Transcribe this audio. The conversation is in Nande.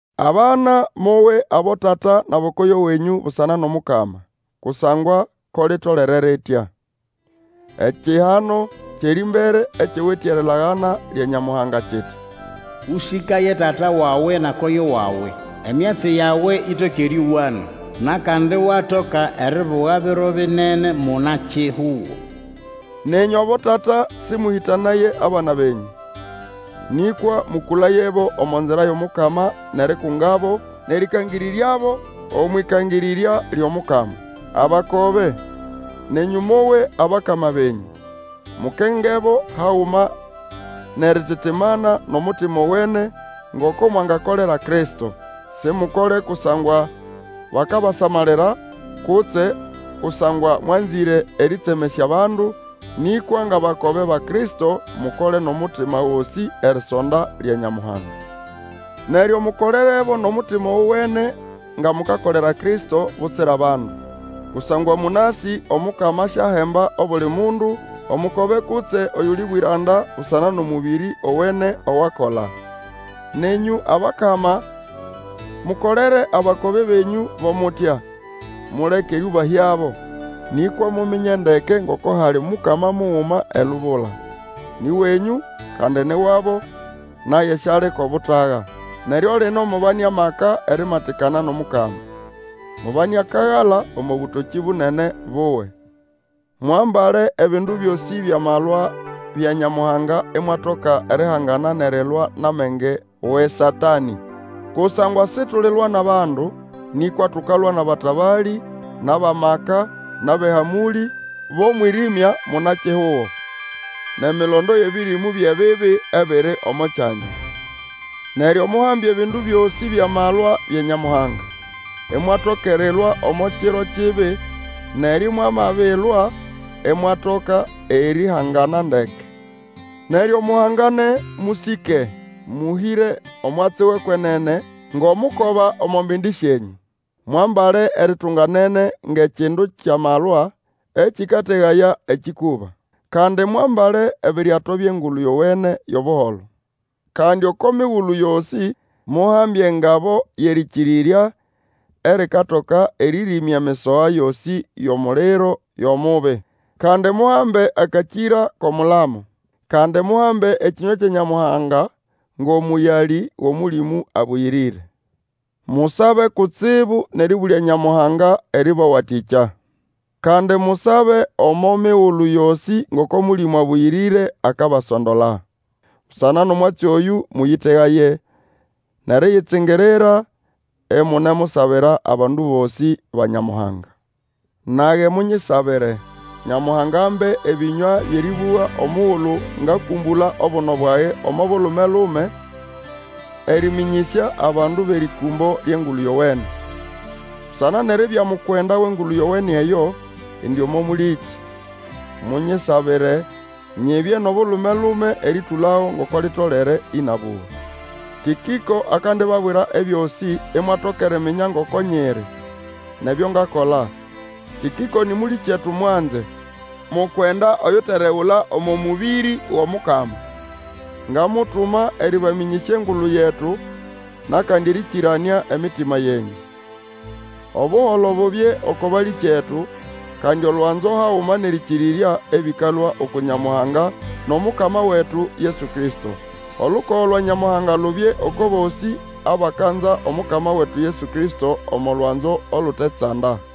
Abana, mowe abotata nʼabokoyo wenyũ busana nʼomukama, kusangwa ko litolere litya. Ekihano kyʼerĩmbere ekiwite erilagana lya Nyamuhanga kiti, Ũsĩkaye tata wawe na koyo wawe, emyatsi yawe itoke erĩowana, nʼakandi iwatoka eribuga biro binene muna-kihugo. Nenyũ abotata, sĩmũhĩtanaye abana benyũ, nĩkwa mũkũlayebo omo nzira yʼomukama, nʼerikungabo, nʼerĩkangĩrĩryabo, omwʼĩkangĩrĩrya lyʼomukama. Abakobe, nenyũ mowe abakama benyũ, mukengebo haguma nʼerititimana nʼomutima owene, ngoko mwangakolera Kristo. Simukole kusangwa bakabasamalira kutse kusangwa mwanzĩre erĩtsemesya abandu, nĩkwa ngʼabakobe ba Kristo, mukole nʼomutima gosĩ erisonda lya Nyamuhanga. Neryo mukolerebo nʼomutima ogowene nga mukakolera Kristo, butsira bandu. Kusangwa mũnasĩ Omukama asyahemba obuli mundu, omukobe kutse oyuli bwĩranda busana nʼomũbĩrĩ ogowene owakola. Nenyũ abakama, mukolere abakobe benyũ bo mutya, muleke erĩũbahyabo. Nĩkwa muminye ndeke ngoko hali Mukama muguma elubula. Nĩ wenyũ, kandi ni wabo, naye syali ko butaga. Neryo lino, mubane amaka erimatikana nʼomukama. Mubane akagala omo bũtokĩ bunene buwe. Mwambale ebindu byosĩ byʼamalwa bya Nyamuhanga imwatoka erihangana nʼerilwa nʼamenge wʼeSatanĩ. Kusangwa situlilwa nʼabandu, nĩkwa tukalwa nʼabatabalĩ, nʼabʼamaka, nʼabʼehamũlĩ bʼomwĩrĩmya muna-kihugo, nʼemilondo yʼebĩrĩmũ byʼebibi ebiri omo kyanya. Neryo muhambe ebindu byosĩ byʼamalwa bya Nyamuhanga, imwatoka erilwa omo kiro kibi, neryo mwamabilwa, imwatoka erihangana ndeke. Neryo muhangane, mũsĩke, mũhĩre omwatsi wʼekwenene ngʼomukoba omo mbindi syenyũ. Mwambale eritunganene ngʼekindu kyʼamalwa ekĩkategaya ekĩkũba. Kandi mwambale ebiryato byʼEngulu Yowene yʼobuholo. Kandi oko migulu yosĩ muhambe engabo yʼerĩkĩrĩrya erikatoka erĩrĩmya emisoha yosĩ yʼomuliro yʼomubi. Kandi muhambe akakĩra kʼomulamo. Kandi muhambe ekĩnywa kya Nyamuhanga ngʼomũyalĩ wʼOmũlĩmũ Abũyĩrĩre. Musabe kutsibu nʼerĩbũlya Nyamuhanga erĩbawatĩkya. Kandi musabe omo migulu yosĩ ngoko Mũlĩmũ Abũyĩrĩre akabasondola. Busana nʼomwatsi oyũ, mũyĩtegaye, nʼeriyitsingirira, imunemusabira abandu bosĩ ba Nyamuhanga. Nage, munyisabire, Nyamuhanga ambe ebĩnywa byʼerĩbũga omugulu ngakũmbũla obuno bwage omo bulume-lume erĩmĩnyĩsya abandu bʼerĩkũmbo lyʼEngulu Yowene. Busana nʼeribya mukwenda wʼEngulu Yowene eyo, indi omo mũlĩkĩ. Munyisabire nyibye nʼobulume-lume erĩtũlago ngoko litolere ĩnabũga. Tĩkĩko akandibabwira ebyosĩ, imwatoka eriminya ngoko nyiri, nʼebyo ngakola. Tĩkĩko nĩ mũlĩkyetu mwanze, mukwenda oyuteregula omo mũbĩrĩ wʼOmukama. Ngamutuma erĩbamĩnyĩsya engulu yetu nʼakandi erĩkĩranĩa emitima yenyũ. Obuholo bubye oko balĩkyetu, kandi olwanzo haguma nʼerĩkĩrĩrya ebĩkalũa uku Nyamuhanga nʼomukama wetu Yesu Kristo. Olukogo lwa Nyamuhanga lubye oko bosĩ abakanza Omukama wetu Yesu Kristo omo lwanzo olutetsanda.